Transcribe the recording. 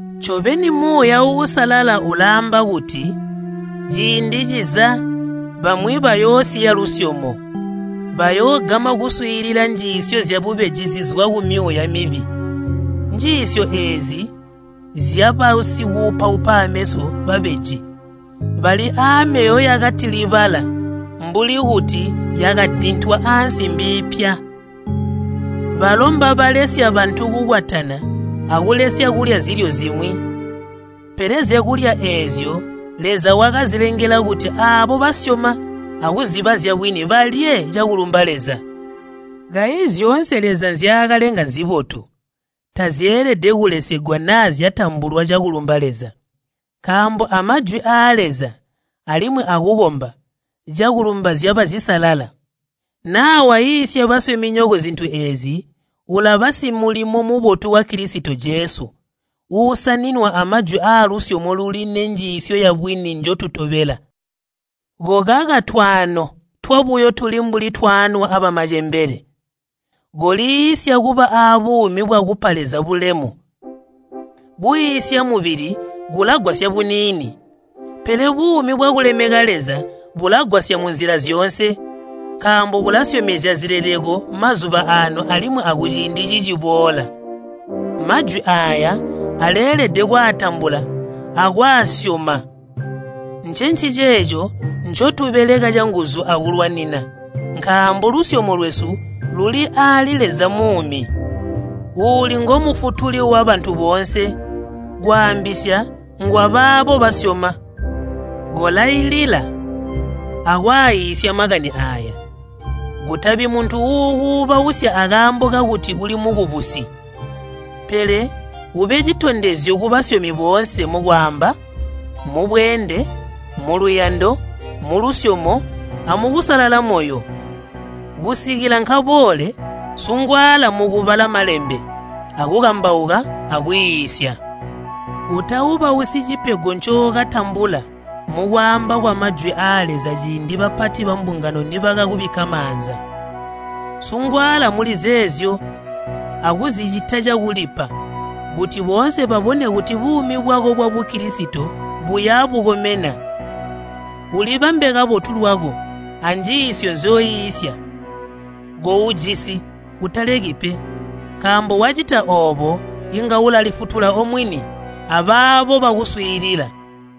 Ncobeni Muuya Uusalala ulaamba kuti ciindi ciza bamwi bayoosiya lusyomo. Bayoogama kuswiilila njiisyo zyabubeji zizwa kumyuuya mibi. Njiisyo eezi nzyabasikuupaupa aameso babeji, bali aamyoyo yakatilibala mbuli kuti yakadintwa aansimbi iipya. Balo mbabalesya bantu kukwatana akulesya kulya zilyo zimwi. Pele zyakulya eezyo Leza wakazilengela kuti aabo basyoma akuziba zyabwini balye cakulumba Leza. Kayi zyoonse Leza nzyaakalenga nzibotu, tazyeelede kulesegwa naa zyatambulwa cakulumba Leza. Nkaambo a Majwi aa Leza alimwi akukomba cakulumba zyaba zisalala. Naa waiisya basyominyoko zintu eezi, ulaba simulimo mubotu wa Kilisito Jesu, uusaninwa amajwi aalusyomo luli nenjiisyo yabwini njotutobela. Kokaka twaano twabuyo tuli mbuli twaanwa amacembele. Koliisya kuba abuumi bwakupa Leza bulemu. Kuiisya mubili kulagwasya buniini, pele buumi bwakulemeka Leza bulagwasya munzila zyoonse, nkaambo bulasyomezya zileleko mazuba aano alimwi akuciindi ciciboola. Majwi aaya aleelede kwaatambula akwaasyoma. Ncenciceeco ncotubeleka canguzu akulwanina, nkaambo lusyomo lwesu luli aali Leza muumi, uuli ngo Mufutuli wabantu boonse, kwaambisya ngwabaabo basyoma. Kolailila akwaiisya makani aaya. Kutabi muntu uukuubausya akaambo kakuti uli mukubusi. Pele ube citondezyo kubasyomi boonse mukwaamba, mubweende, muluyando, mulusyomo, amukusalala moyo. Kusikila nkaboole, sungwaala mukubala Malembe akukambauka, akwiisya. Utaubasyi cipego ncookatambula mukwaamba kwa Majwi aa Leza ciindi bapati bambungano nibakakubikka maanza. Sungwaala muli zeezyo akuzicita cakulipa, kuti boonse babone kuti buumi bwako bwa Bukilisito buya bukomena. Ulibambe kabotu lwako anjiisyo nzyoiisya. Koujisi utaleki pe, nkaambo wacita oobo, inga ulalifutula omwini, abaabo bakuswiilila.